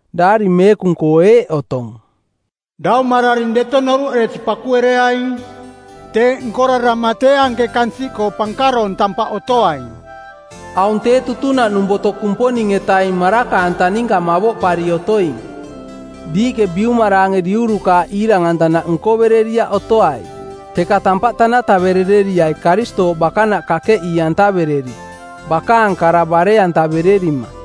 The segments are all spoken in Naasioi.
Daari Meekung-koo eeꞌ otong, “Daumararing deto noruꞌeresi pakuereaing. Teeꞌ nkorarama tee anke kansiꞌkoo pankaroong tampaꞌ otoaing.” Aung tee tutunaꞌnung boto Kumponing-etaing maraka-anta ninka mavoꞌpari otoing. Diiꞌke biumaraange diurukaaꞌ iirang-antanaꞌ nkovereriaꞌ otoai, teka tampaꞌ tanataverereriai Karistooꞌ bakanaꞌ kakeꞌii-antavereri, bakaang kara bare-antavererima.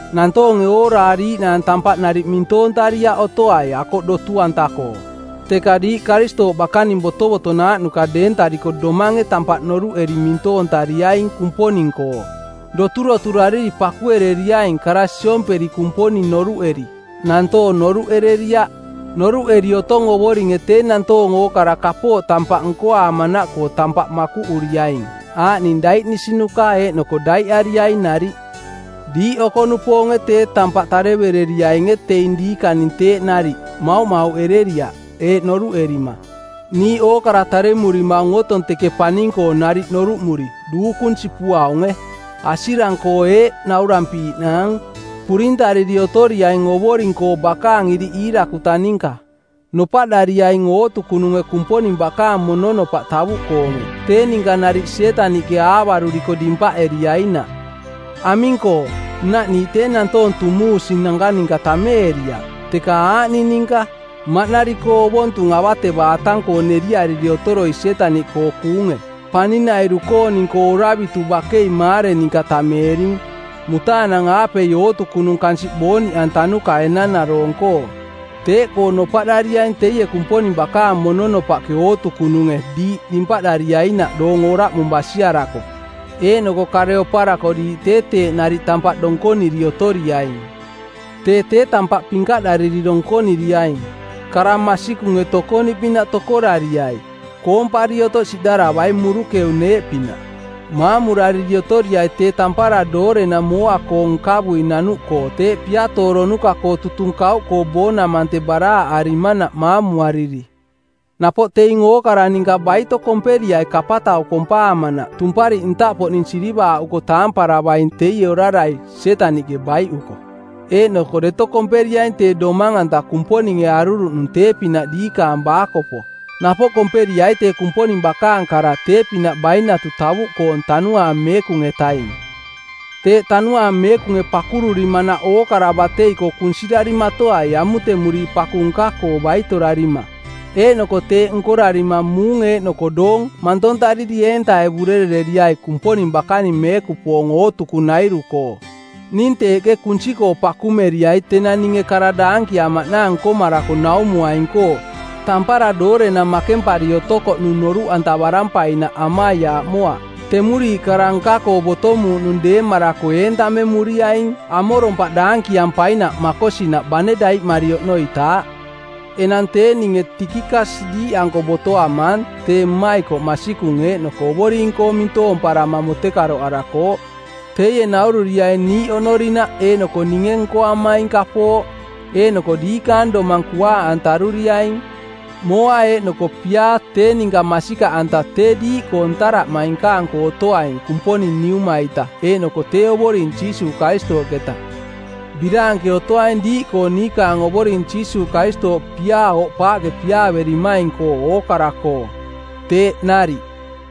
Nantoonge ooraariiꞌnaang tampaꞌ nariꞌ mintoontariaꞌ otoai akoꞌ dotu-anta-koo, teka diiꞌ Karistooꞌ bakaning botovotonaaꞌnuka deentariko domange tampaꞌ noruꞌeri mintoontariaing Kumponing-koo. Doturoturariri pakuereriaing kara siomperi – Kumponing noruꞌeri, nantoong noruꞌ ereriaꞌ. Noruꞌeri otong Ovoringe tee nantoong ookara kapooꞌ tampaꞌ nkoaamanaꞌkoo tampaꞌ makuꞌuriaing aaꞌning daiꞌnisinuka eeꞌnoko daiꞌariaing nariꞌ. Diiꞌ oko-nupoonge tee tampaꞌ tarevereriainge teing diikaning teeꞌ nariꞌ, mauꞌmauꞌereriaꞌ eeꞌ noruꞌerima: “Niiꞌ ookara taremurimaung otong teke paning-koo nariꞌ noruꞌmuri, duukung sipuaunge.” Asirang-koo eeꞌ naurampiiꞌnaang: Purintariri otoriaing Ovoring-koo bakaang iriꞌ iirakuta ninka. Nopaꞌdariaing ootukununge Kumponing bakaang mononopaꞌ tavuꞌkoonge tee ninka nariꞌ Sietaniꞌke aavaruriko dimpaꞌeriainaꞌ. Aming-koo, nnaꞌ niiꞌ tee nantoong tumuusinanka ninka tameeriaꞌ, teka aaꞌning ninka: maꞌnari-koo ovontung avatevaatang-koo neriariri otoroi Sietaniꞌkoo kuunge, paning-nairu-kooning-koo oravitu bakei maare ninka tameering, mutaanang-aapei ootukunung kansiꞌ booniꞌantanuka enanaroong-koo. Teeꞌkoo nopaꞌdariaing teie Kumponing bakaang mononopaꞌke ootukununge diiꞌ dimpaꞌdariainaꞌ doong oraꞌmung basiarako, eeꞌnoko kare oparako diiꞌ tee teeꞌ nariꞌ tampaꞌ donkoniri otoriaing. Tee tee tampaꞌ pinkaꞌdariri donkoniriaing. Kara masikunge tokoniꞌpinaꞌ tokorariai. Koompari otoꞌ siꞌdaravai murukeu-neeꞌpinaꞌ. Maamurariri otoriai tee tampara doorenang mooa-koong nkavui nanuꞌkoo teeꞌ piatooronuka˜koo tutung kauꞌkoo boonamante˜ baraaꞌarimanaꞌ maamuariri. Napoꞌ teing ookara ninka baito komperiai kapatau kompaamanaꞌ tumpariꞌ ntaꞌpoꞌning sirivaaꞌuko taamparavaing teie orarai, Sietaniꞌke, baiꞌuko. Eeꞌnoko deto komperiaing tee domang-anta Kumponinge aruruꞌnung tee-pinaꞌ diikaang baakopo. Napoꞌ komperiai tee Kumponing bakaang kara tee-pinaꞌ bainatu tavuꞌkoong Tanuaang Meekung-etaing. Teeꞌ Tanuaang Meekunge pakururimanaꞌkoo ookara batei-koo kunsirarimatoai amutemuriiꞌ paku nka-koo baitorarima. Eeꞌnoko teeꞌ nkorarima muung eeꞌnoko doong mantontariri eentaevurerereriai Kumponing bakaning meekupoong ootukunairu-koo. Ning teeꞌke kunsi-koo pakumeriai tenang ninge kara daankiamaꞌnaang nkomarako naumuaining-koo, tampara doorenang makempari otokoꞌnung noruꞌantavarampainaꞌ amaiaaꞌmoaꞌ. Temuriiꞌ kara nka-koo botomuuꞌnung deemarako entamemuriaing amorompaꞌ daankiampainaꞌ makosinaꞌ bane daiꞌmari oꞌnoitaaꞌ. Enang tee ninge Tikikas diiꞌanko botoamaang tee mmaikoꞌ masikung eeꞌnoko Ovoring-koo mintoomparama mutekaroꞌarakooꞌ. Teie naururiaing niiꞌ oꞌnorinaꞌ eeꞌnoko ninge nkoamaing kapooꞌ, eeꞌnoko diikaang domang kuaaꞌantaruriaing. Mooa eeꞌnoko piaa tee ninka masikaꞌanta tee diiꞌkoo ntaraꞌmainkaang-koo otoaing Kumponing Niuma-ita eeꞌnoko tee Ovoring Jiisuuꞌ Karistooꞌketa. Biraanke otoaing diiꞌkoo niikaang Ovoring Jiisuuꞌ Karistooꞌ piaa oꞌpaaꞌke piaaverimaing-koo ookara-koo. Teeꞌ nariꞌ.